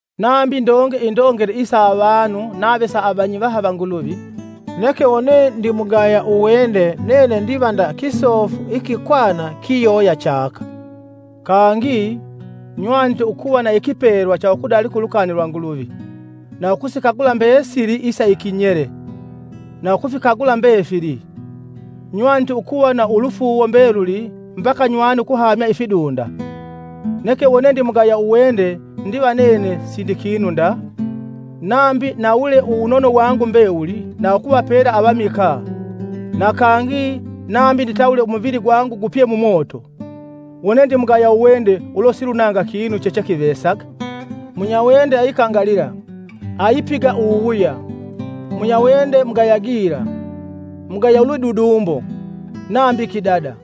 Nambi ndonge indongele isa avanu nave sa avanyivaha va Nguluvi, neke wone ndimugaya uwende nene ndiva nda kisofu ikikwana kiyoya chaka. Kangi, nywanite ukuva na ikipelwa cha ukudalika ulukani lwa Nguluvi, na ukusikagula mbesili isa ikinyele, na ukufikagula mbefili; nywanite ukuva na ulufuuwo mbeluli mbaka nywane ukuhamya ifidunda, neke wone ndimugaya uwende ndiva nene sindi kinu nda. Nambi nawule uwunono wangu mbewuli na ukuvapela avamikaa, na kangi nambi nditawule umuvili gwangu gupye mumoto, wone ndimugaya uwende ulo silunanga kinu chechekivesaga. Munyawende aikangalila, ayipiga uwuwuya; munyawende mugaya gila, mugaya ulwidudumbo, nambi kidada.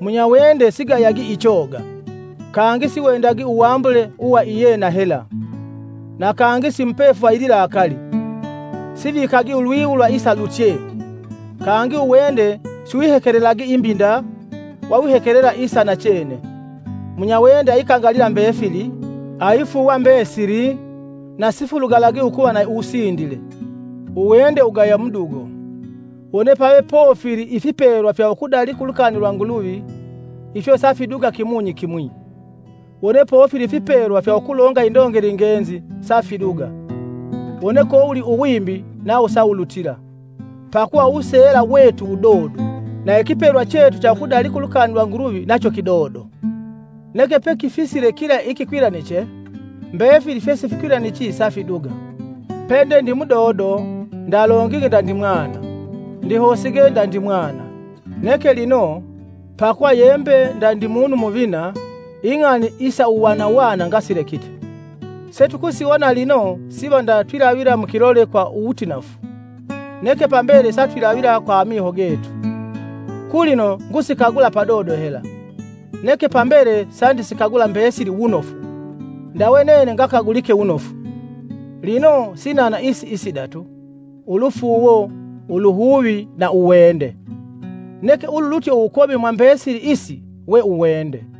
Munyawende sigayagi ichoga, kangi siwendagi uwambule uwa iyena hela, na kangi simupefu va ililakali; sivikagi ulwiwu lwa isalutye, kangi uwende siwihekelelagi imbi nda, wawihekelela isa nachene. Munyawende aikangalila mbefili, aifuuwa mbesili na sifulugalagi ukuva na uwusindile. Uwende wugaya mudugo. Wone pave pofili ifipelwa fya ukudalika ulukani lwa Nguluvi, ifyo safiduga kimunyi kimwi, wone pofili ifipelwa fya ukulonga indongele ngenzi, safiduga; wone kowuli uwimbi, nawo sawulutila. Pakuva uwuseela wetu wudodo, na ikipelwa chetu cha ukudalika ulukani lwa Nguluvi nacho kidodo. Neke pekifisile kila ikikwilaniche, mbefili fyesifikwilanichi safiduga. Pende ndi mudodo, ndalongige ndandi mwana, ndihosige ndandi mwana. Neke lino, pakuva ye mbe ndandi munu muvina, ing'ani isa uwanawana ngasilekite. Setukusiwona lino siva nda twilavila mukilole kwa wutinafu, neke pambele satwilavila kwa amiho getu. Kulino ngusikagula padodo hela, neke pambele sandisikagula mbesili wunofu, ndawe nene ngakagulike wunofu. Lino sinana isi isidatu: ulufuuwo, uluhuvi na uwende; neke ululutye uwukomi mwa mbesili isi we uwende.